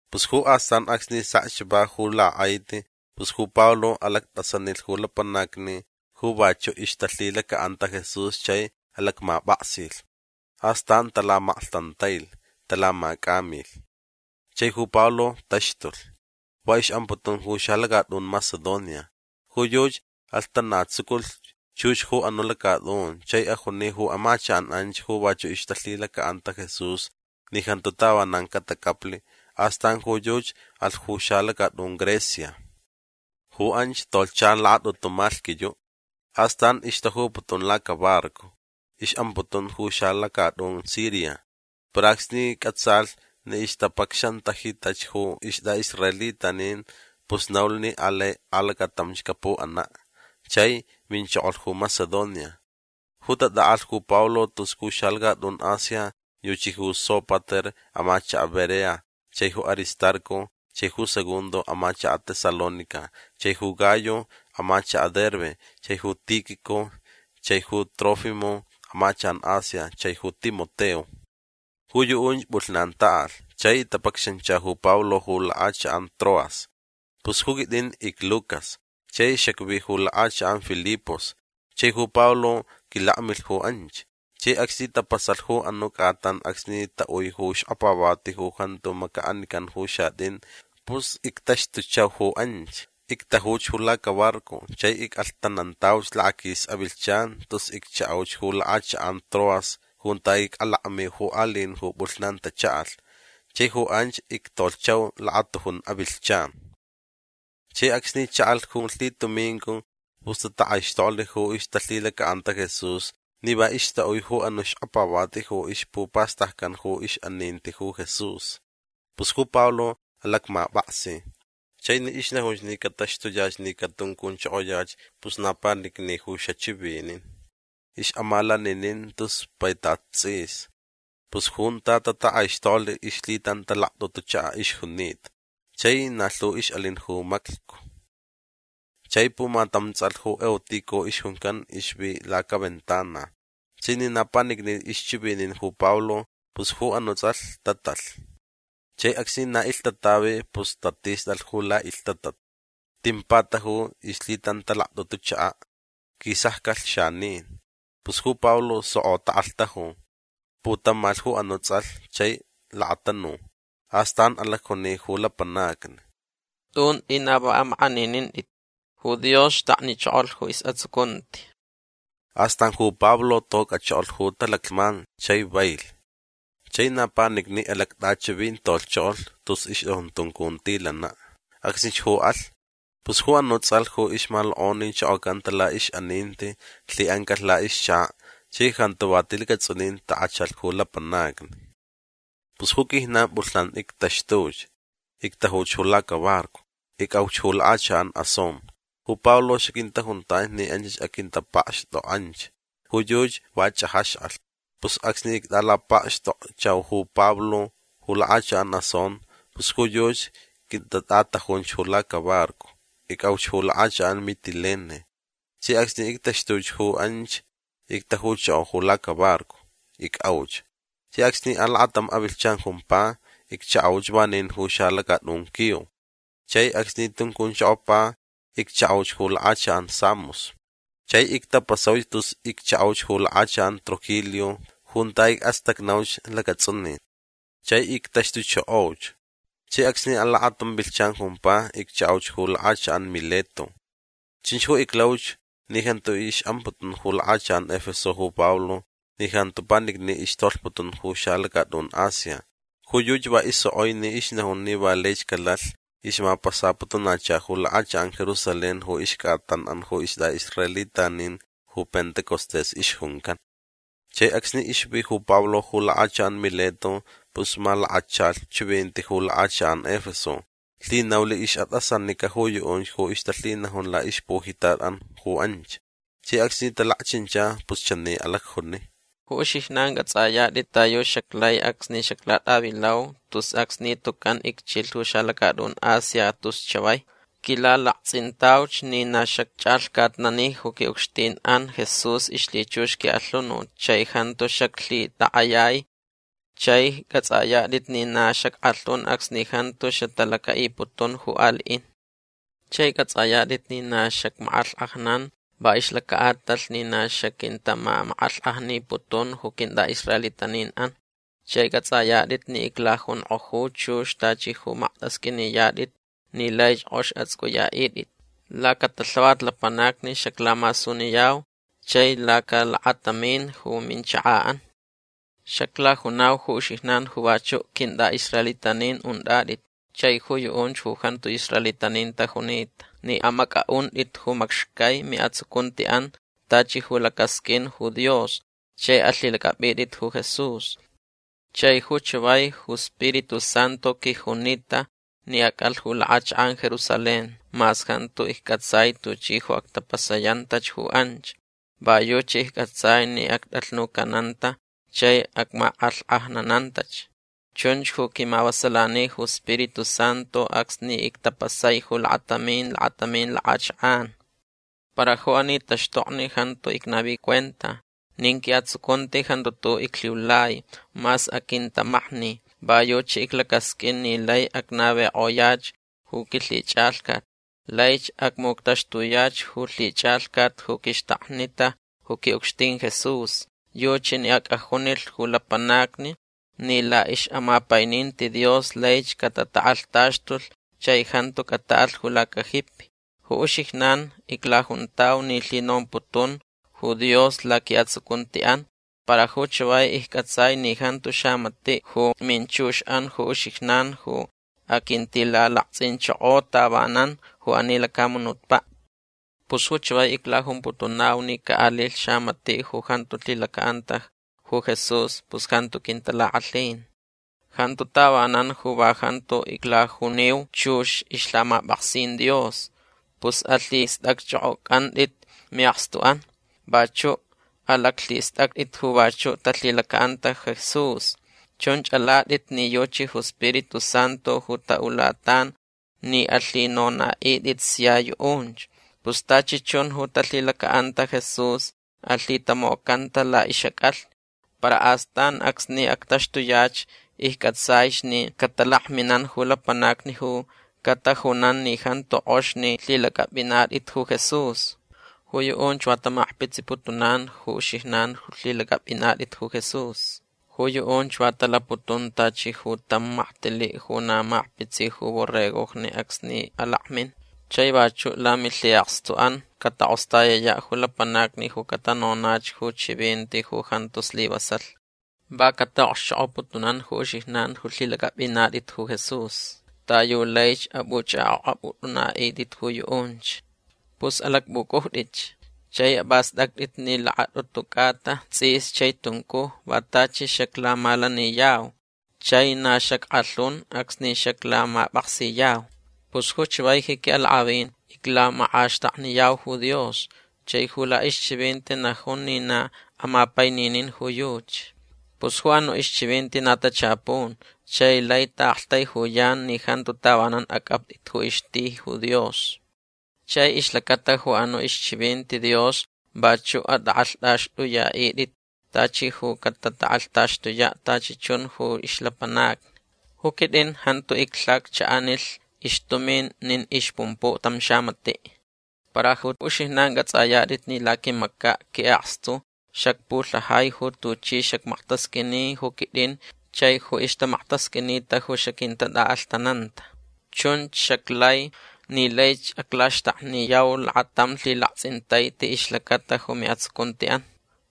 Pus ju astan acsni sekch va ju lak'aiti pus ju Pablo alact'asanilh ju lapanacni ju vachu' ixtalhilaca'anta Jesús chai alacmap'aksilh. Astan talamaklhtantailh. Talamac'amilh. Chai ju Pablo taxtulh. Va ix'amputun ju xalacat'un Macedonia. Ju yuchi alhtanatsuculh chux ju anu' lacat'un chai ajuni ju amachak'an anch ju vachu' ixtalhilaca'anta Jesús ni jantu tavanan catacaplh. Astan ju yuchi alh ju xalacat'un Grecia. Ju anch tolhcha lakat'utu malhquiyu'. Astan ixtajuputun lacabarco. Ix'amputun ju xalacat'un Siria. Para acsni c'atsalh ni ixtapacxantajitach ju ist'a'israelitanin pus naulh ni alai alacatamch capu'ana'. Chai minchokolh ju Macedonia. Ju tat'a'alh ju Pablo tus ju xalacat'un Asia yuchi ju Sópater amachaka' Berea chai ju Aristarco chai ju Segundo amachaka' Tesalónica chai ju Gayo amachaka' Derbe chai ju Tíquico chai ju Trófimo amachak'an Asia chai ju Timoteo. Ju yu'unch p'ulhnan ta'alh chai tapacxancha ju Pablo ju lak'achak'an Troas. Pus ju quit'in icLucas chai xacvi ju lak'achak'an Filipos. Chai ju Pablo quilakmilh ju anch. Chai acsni tapasalh ju anu' c'atan acsni ta'ui ju xkapavati ju jantu maca'anican ju xat'in pus ictaxtuchau ju anch. Ictajuch ju lacabarco chai ic'alhtanantauch lakaquis avilhchan tus iccha'auch ju lak'achak'an Troas junta ic'alakmiu ju ali'in ju p'ulhnan tacha'alh. Chai ju anch ictolhchau lakatujun avilhchan. Chai acsni cha'alh ju lhitumincu pus tatak'aixtoklh ju ixtalhilaca'anta Jesús ni va ixta'ui ju anu' xkapavati ju ixpupastaccan ix'aninti ju Jesús. Pus ju Pablo alacmap'aksi. Chai ni ixnajunch ni cataxtuyach ni catuncunchokoyach pus na panicni ju xachivinin. Ix'amalaninin tus paitat ts'is. Pus junta tatak'aixtoklh ixlhitantalact'utu chaka' ixjunita. Chai na lhu ix'alin ju maclhcu. Chai pumatam ts'alh ju Eutico ixjuncan ixvi lacaventana. Chai ni na panicnich ixchivinin ju Pablo pus ju anu' ts'alh lhtatalh. Chai acsni na ilhtatavi pus tatist'alh ju la'ilhtatat. Tin pataju ixlhitantalact'utu chaka'. Quisaccalh xanin. Pus ju Pablo soko tak'alhtaju. Putamalhch ju anu' ts'alh chai lakatanu. Astan alacjuni ju lapanacni: ―Tunt'i na va amak'aninint'it. Ju Dios xtaknichokolh ju is'atsucunti. Astan ju Pablo toc'achokolh ju talaclhman chai vailh. Chai na panicni alact'achivintolhchokolh tus ixt'ajun tuncuntilana'. Acsnich ju alhch. Pus ju anu' ts'alh ju ixmalok'onichokocanta la'ix'aninti lhi'ancalh la'ixchaka' chai jantu va tilacats'unin tak'achalh ju lapanacni. Pus ju quijnan p'ulhnan ictaxtuch. Ictajuch ju lacabarco. Ic'auch ju lak'achak'an Asón. Ju Pablo xaquintajuntanch ni anchach aquintapakxt'ok'anch. Ju yuchi va ch'ajax'alh. Pus acsni ict'alapakxtokchau ju Pablo ju lak'achak'an Asón pus ju yuchi quintat'atajunch ju lacabarco. Ic'auch ju lak'achak'an Mitilene. Chai acsni ictaxtuch ju anch ictajuchoko ju lacabarco. Ic'auch. Chai acsni alakatam avilhchan jumpa iccha'auch vanin ju xalacat'un Quío. Chai acsni tuncunchokopa iccha'auch ju lak'achak'an Samos. Chai ictapasauch tus iccha'auch ju lak'achak'an Trogilio junta ic'astacnauch lacats'unin. Chai ictaxtuchokoch. Chai acsni alakatam avilhchan jumpa iccha'auch ju lak'achak'an Mileto. Chunch ju iclauch ni jantu ix'amputun ju lak'achak'an Efeso ju Pablo ni jantu panicni ixtolhputun ju xalacat'un Asia. Ju yuchi va isok'oi ni ixnajun ni va laich calalh ixmapasaputunacha ju lak'achak'an Jerusalén ju ixc'atan'an ju ist'a'israelitanin ju Pentecostés ixjuncan. Chai acsni ixvi ju Pablo ju lak'achak'an Mileto pus malakachalh chivinti ju lak'achak'an Efeso. Lhinaulh ix'at'asanica ju yu'unch ju ixtalhinajun la'ixpujitat'an ju anch. Chai acsni talakchincha pus chani alacjuni: ―Ju uxijnan c'ats'ayat'it ta yu xaclai acsni xaclat'avilau tus acsni tucan icchilh ju xalacat'un Asia tus chavai. Quilalakts'intauch ni na xacch'alhcatnani ju qui'ucxtin'an Jesús ixlhichux qui'alhunut chai jantu xaclhitak'ayai. Chai c'ats'ayat'it ni na xack'alhun acsni jantu xatalaca'iputun ju ali'in. Chai c'ats'ayat'it ni na xacmak'alhk'ajnan va ixlaca'atalh ni na xaquintamamak'alhk'ajniputun ju quint'a'israelitanin'an. Chai c'ats'ayat'it ni iclajunk'oju chux tachi ju makt'asq'uiniyat'it ni laich k'ox ats'uc'uya'it'it. Lacatalhavat lapanacni xaclamasuniyau chai lacalakatamin ju minchaka'an. Xaclajunau ju uxijnan ju vachu' quint'a'israelitanin unt'at'it chai ju yu'unch ju jantu israelitanin tajunita ni amac'a'unt'it ju macxcai mi'atsucunti'an tachi ju lacasq'uin ju Dios chai alhilac'ap'it'itch ju Jesús. Chai ju chavai ju Spiritu Santu quijunita ni ac'alh ju lak'achak'an Jerusalén mas jantu icc'atsai tuchi ju actapasayantach ju anch. Va yuchi icc'atsai ni act'alhnucananta chai acmak'alhk'ajnanantach. Chunch ju quimavasalani ju Spiritu Santu acsni ictapasai ju lakatamin lakatamin lak'achak'an. Para ju ani taxtokni jantu icnavi cuenta. Nin qui'atsucunti jantu tu'u' iclhiulai mas aquintamakni. Va yuchi iclacasq'uin ni lai acnavik'oyach ju quilhich'alhcat. Laich acmuctaxtuyach ju lhich'alhcat ju quixtaknita ju qui'ucxtin Jesús. Yuchi ni ac'ajunilh ju lapanacni ni la'ix'amapaininti Dios laich catatak'alhtaxtulh chai jantu cata'alh ju lacajipi. Ju uxijnan iclajuntau ni lhinomputun ju Dios laqui'atsucunti'an. Para ju chavai icc'atsai ni jantu xamati' ju minchux'an ju uxijnan ju aquintilalakts'inchoko tavanan ju ani lacamunutpa'. Pus ju chavai iclajumputunau ni ca'alilh xamati' ju jantu lhilaca'anta ju Jesús pus jantu quintalak'alhin. Jantu tavanan ju va jantu iclajuniu chux ixlhamap'aksin Dios. Pus alhist'acch'ok'oc'ant'it mi'akstu'an. Vachu' alaclhist'act'it ju vachu' talhilaca'anta Jesús. Chunch alat'it ni yuchi ju Spiritu Santu ju ta'ulatan ni alhinona'it'it sia yu'unch. Pus tachi chun ju talhilaca'anta Jesús alhitamocanta la'ix'ac'alhni. Para astan acsni actaxtuyach icc'atsaich ni catalakminan ju lapanacni ju catajunan ni jantu k'ox ni lhilac'ap'inat'it ju Jesús. Ju yu'unch va tamakpitsiputunan ju uxijnan ju lhilac'ap'inat'it ju Jesús. Ju yu'unch va talaputun tachi ju tam maktili' ju na makpitsi ju borregojni acsni alakmin. Chai vachu' lamilhi'akstu'an catak'ostayaya' ju lapanacni ju catanonach ju chivinti ju jantu slivasalh. Va cata'okxchok'oputunan ju uxijnan ju lhilac'ap'inat'it ju Jesús ta yu laich ap'uch'ak'ok'ap'ut'una'it'it ju yu'unch. Pus alacp'uc'ujt'itch. Chai ap'ast'act'itch ni lakat'utu c'ata ts'is chai tuncuj va tachi xaclamalaniyau. Chai na xack'alhun acsni xaclamap'aksiyau. Pus ju chavai ji qui'alak'avin iclamak'axtakniyau ju Dios. Chai ju la'ixchivinti najun ni na amapaininin ju yuchi. Pus ju anu' ixchivinti na tachapun chai lai ta'aktaijuyan ni jantu tavanan ac'apt'it ju ixti ju Dios. Chai ixlacata ju anu' ixchivinti Dios vachu' at'ak'alht'axt'uya'it'it tachi ju catatak'alhtaxtuya' tachi chun ju ixlapanacni. Ju quit'in jantu iclhaccha'anilh ixtumin nin ixpumpu' tam xamati'. Para ju uxijnan c'ats'ayat'it ni laquimaca' qui'akstu xacpulhajai ju tuchi xacmaktasq'uini ju quit'in chai ju ixtamaktasq'uinita ju xaquintat'a'alhtananta. Chunch xaclai ni laich aclaxtakniyau lakatam lhilakts'intaiti ixlacata ju mi'atsucunti'an.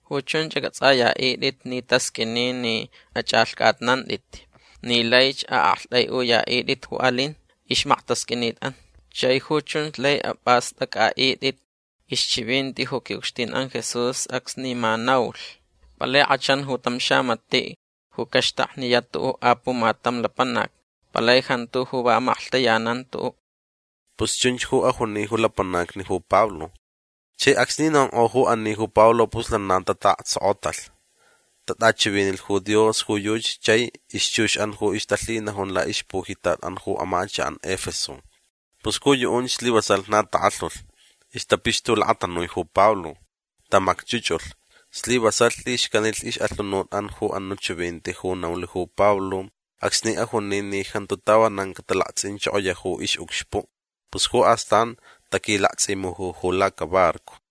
Ju chunch ac'ats'aya'it'it ni tasq'uini ni ach'alhc'atnant'it ni laich a'akt'ai'uya'it'it ju alin ixmaktasq'uinit'an. Chai ju chunch lai ap'ast'ac'a'it'it ixchivinti ju qui'ucxtin'an Jesús acsni ma naulh: “Palai k'achan ju tam xamati' ju caxtakniya' tu'u' apumatam lapanac. Palai jantu ju va amaklhtayanan tu'u'”. ―Pus chunch ju ajuni ju lapanacni ju Pablo. Chai acsni nonk'o ju ani ju Pablo pus lana ta'aktsokotalh. T'achivinilh ju Dios ju yuchi chai ixchux'an ju ixtalhinajun la'ixpujitat'an ju amachak'an Efeso. Pus ju yu'unch slivasalh na tak'alhulh. Ixtapixtulakatanui ju Pablo. Tamacch'uch'ulh. Slivasalh lhixcanilh ix'alhunut'an ju anu' chivinti ju naulh ju Pablo acsni ajuni ni jantu tavanan catalakts'inichokoya' ju ix'ucxpu'. Pus ju astan taquilakts'imuju ju lacabarco.